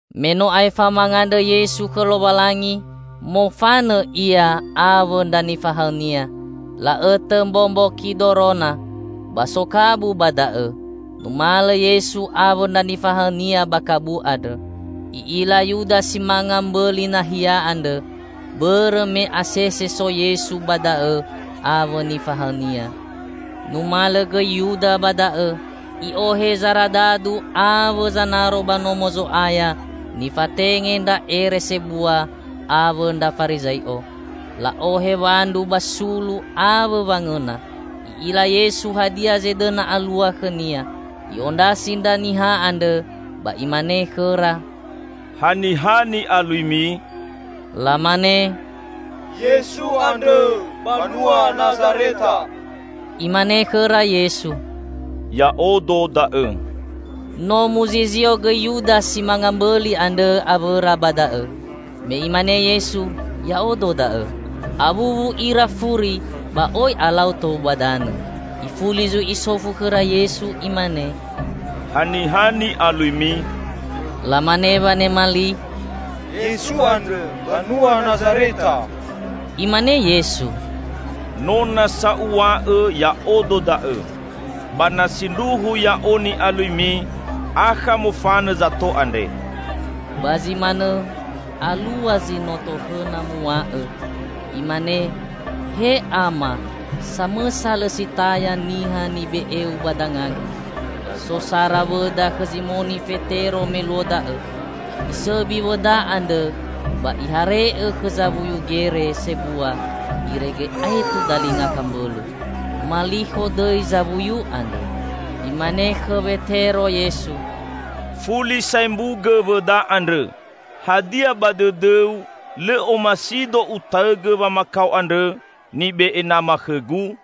Me no aefa mangandrõ Yesu khõ Lowalangi, mofanõ Ia awõ ndra nifahaõ-Nia, la'õtõ mbombo Kidorona. Ba so kabu ba da'õ. Numalõ Yesu awõ ndra nifahaõ-Nia ba kabu andrõ. I'ila Yuda si manga mbõli nahia andrõ, bõrõ me asese so Yesu ba da'õ awõ nifahaõ-Nia. Numalõ gõi Yuda ba da'õ. I'ohe zaradadu awõ zanaro ba Nomo Zo'aya nifatenge ndra ere sebua awõ ndra Farizai'o. La'ohe wandru ba sulu awõ wangõna. I'ila Yesu hadia zedõna alua khõ-Nia. I'ondrasi ndra niha andrõ ba Imane khõra, "Haniha ni'aluimi?" Lamane, "Yesu andrõ, banua Nazareta." Imane khõra Yesu, "Ya'odo da'õ." No muzizio gõi Yuda si manga mbõli andrõ awõra ba da'õ. Me Imane Yesu, "Ya'odo da'õ," awuwu ira furi ba oi alau tou ba danõ. Ifuli zui Isofu khõra Yesu Imane, "Haniha ni'aluimi?" Lamane wanema li, "Yesu andrõ, banua Nazareta." Imane Yesu, "No nasa Uw̃a'õ Ya'odo da'õ. Ba na sindruhu Ya'o ni'aluimi, akha mofanõ zato andre." (Ba zi manõ, alua zi no tohõna muw̃a'õ, imane: "He Ama, samõsa lõ si taya niha nibe'eu ba danga-Gu.") So sara wõda khõ Zimoni Fetero me luo da'õ. Isõbi wõda andrõ ba ihare'õ khõ zawuyu gere sebua irege aetu dalinga kambõlõ. Malikho dõi zawuyu andrõ. Imane khõ Wetero Yesu, "Fuli saembugõ wõda andrõ! Hadia, ba dõdõu lõ omasi-Do Utaõgõ wamakao andrõ nibe'e Nama khõ-Gu?"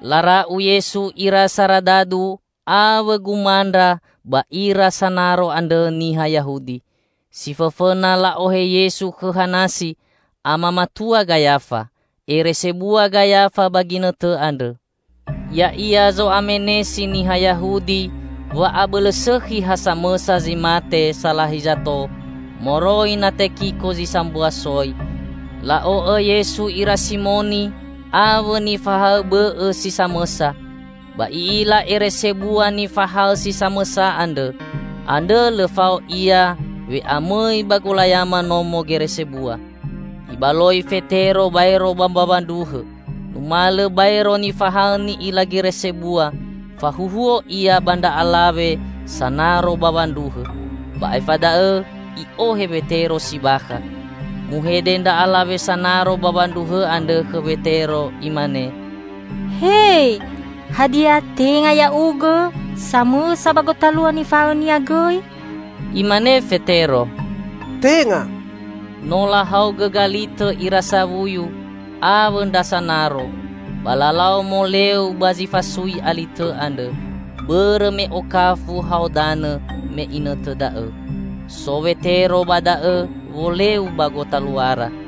Lara'u Yesu ira saradadu awõ gomandra ba ira sanaro andrõ niha Yahudi. Si fõfõna la'ohe Yesu khõ Hanasi, ama matua Gayafa. Ere sebua Gayafa ba ginõtõ andrõ. Ya'ia zo'amenesi niha Yahudi wa abõlõ sõkhi ha samõsa zi mate salahi zato moroi na tekiko zi sambua soi. La'o'õ Yesu ira Simoni awõ nifahaõ bõ'õ si samõsa. Ba i'ila ere sebua nifahaõ si samõsa andrõ; andrõ lõ fao ia we'amõi ba golayama nomo gere sebua, ibaloi Fetero baero ba mbawa ndruhõ. Numalõ baero nifahaõ ni'ila gere sebua, fahuhuo ia ba ndra alawe sanaro bawa ndruhõ, ba aefa da'õ i'ohe Wetero si bakha. Muhede ndra alawe sanaro bawa ndruhõ andrõ khõ Wetero imane, "He, hadia tenga ya'ugõ samõsa ba gotalua nifahaõ-Nia gõi?" Imane Fetero, "Tenga." No lahaogõ galitõ ira sawuyu awõ ndra sanaro, ba lalau moleu ba zi fasui alitõ andrõ, bõrõ me okafu hao danõ me inõtõ da'õ. So Wetero ba da'õ woleu ba gotaluara.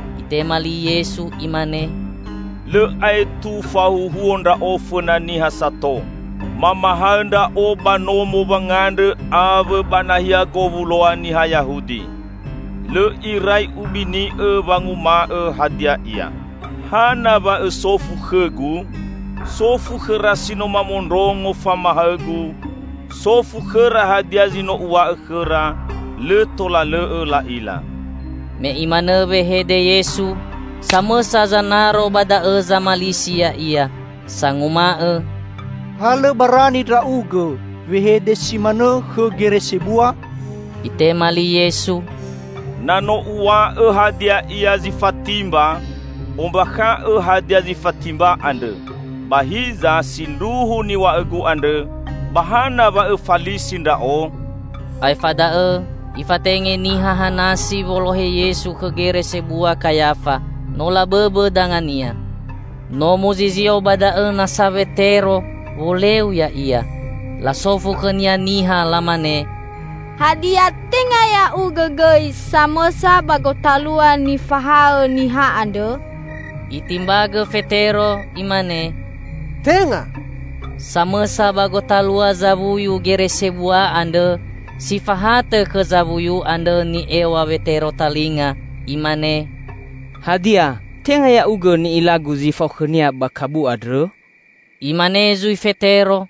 Itema li Yesu Imane, "Lõ aetu fahuhuo Ndra'o fõna niha sato. Mamahaõ Ndra'o ba nomo wangandrõ awõ ba nahia gowuloa niha Yahudi. Lõ irai Ubini'õ wanguma'õ hadia ia. Hana wa õsofu khõ-Gu? Sofu khõra si no mamondrongo famahaõ-Gu. Sofu khõra hadia zi no Uw̃a'õ khõra lõ tola lõ'õ la'ila." Me Imanõ wehede Yesu, samõsa zanaro ba da'õ zamalisi Ya'ia, sanguma'õ, "Ha lõ barani Ndra'ugõ wehede si manõ khõ gere sebua!" Itema li Yesu, "Na no Uw̃a'õ hadia ia zi fatimba, ombakha'õ hadia zi fatimba andrõ! Ba hiza sindruhu niw̃a'õ-Gu andrõ, ba hana wa õfalisi Ndra'o?" Aefa da'õ ifatenge niha Hanasi wolohe Yesu khõ Gere Sebua Kayafa, no la bõbõ danga-Nia. No muzizio ba da'õ nasa Wetero woleu ya'ia. Lasofu khõnia niha lamane, "Hadia, tenga ya'ugõ gõi samõsa ba gotalua nifahaõ niha andrõ?" Itimbagõ Fetero. Imane, "Tenga!" Samõsa ba gotalua zawuyu gere sebua andrõ, si fahatõ khõ zawuyu andrõ ni'ew̃a Wetero talinga, imane, "Hadia, tenga ya'ugõ ni'ilagu zi fao khõ-Nia ba kabu andrõ?" Imane zui Fetero,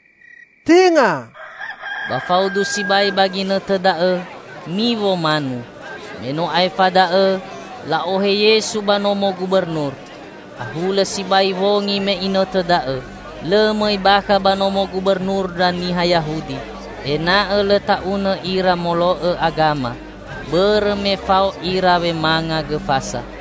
"Tenga," -- ba faudu sibai ba ginõtõ da'õ miwo manu. Meno aefa da'õ la'ohe Yesu ba nomo gubernur. Ahulõ sibai wongi me inõtõ da'õ. Lõ mõi bakha ba nomo gubernur ndra niha Yahudi. Ena'õ lõ ta'unõ ira molo'õ agama, bõrõ me fao ira wemanga Gõ Fasa.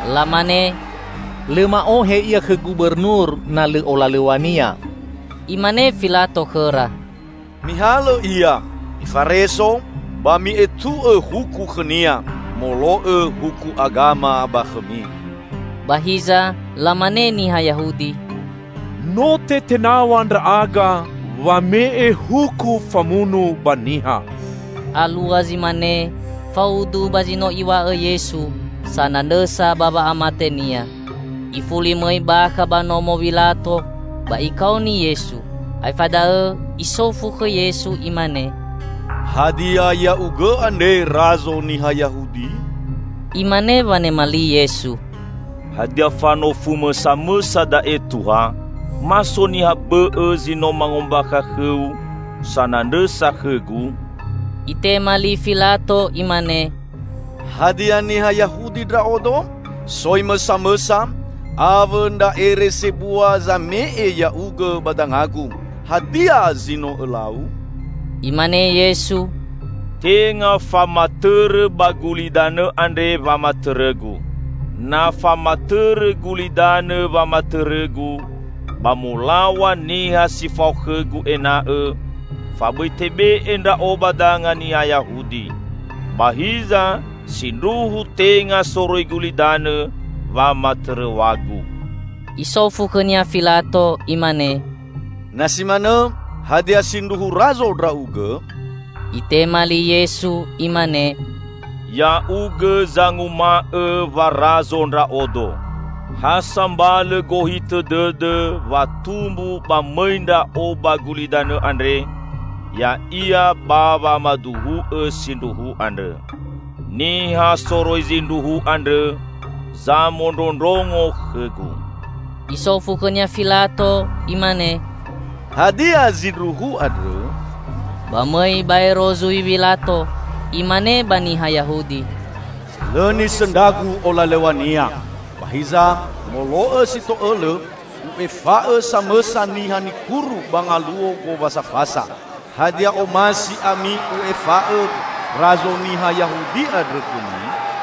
Lamane, "Lõ ma'ohe Ia khõ Gubernur na lõ olalõw̃a-Nia." Imane Filato khõra, "Mihalõ Ia, mifareso ba mi'etu'õ huku khõ-Nia molo'õ huku agama ba khõmi!" Ba hiza lamane niha Yahudi, "No tetenaw̃a ndra'aga wame'e huku famunu ba niha." (Alua zi mane faudu ba zi no Iw̃a'õ Yesu, sanandrõsa ba wa'amate-Nia.) Ifuli mõi bakha ba nomo Wilato ba ikaoni Yesu. Aefa da'õ isofu khõ Yesu imane, "Hadia Ya'ugõ andre Razo niha Yahudi?" Imane wanema li Yesu, "Hadia fanofumõ samõsa da'e Tuha, ma so niha bõ'õ zi no mangombakha khõu sanandrõsa khõ-Gu?" Itema li Filato imane, "Hadia niha Yahudi ndra'odo? Soi-Mõ samõsa awõ ndra ere sebua zame'e Ya'ugõ ba danga-Gu. Hadia zi no Õlau?" Imane Yesu, "Tenga famatõrõ ba gulidanõ andre wamatõrõ-Gu. Na famatõrõ gulidanõ wamatõrõ-Gu, ba molaw̃a niha si fao khõ-Gu ena'õ fabõi tebe'e Ndra'o ba danga niha Yahudi. Ba hiza sindruhu tenga soroi gulidanõ wamatõrõw̃a-Gu!" Isofu khõnia Filato imane, "Na si manõ hadia sindruhu razo Ndra'ugõ?" Itema li Yesu imane, "Ya'ugõ zanguma'õ wa razo Ndra'odo. Ha sambalõ gohitõ dõdõ wa tumbu ba mõi Ndra'o ba gulidanõ andre, ya'ia, ba wamaduhu'õ sindruhu andrõ. Niha soroi zindruhu andrõ, zamondrondrongo khõ-Gu." Isofu khõnia Filato imane, "Hadia zindruhu andrõ?" Ba mõi baero zui Wilato, imane ba niha Yahudi, "Lõ nisõndragu olalõw̃a-Nia. Ba hiza molo'õ si to'õlõ u'efa'õ samõsa niha nikuru ba Ngaluo Gowasa Fasa. Hadia, omasi ami u'efa'õ razo niha Yahudi andrõ khõmi?"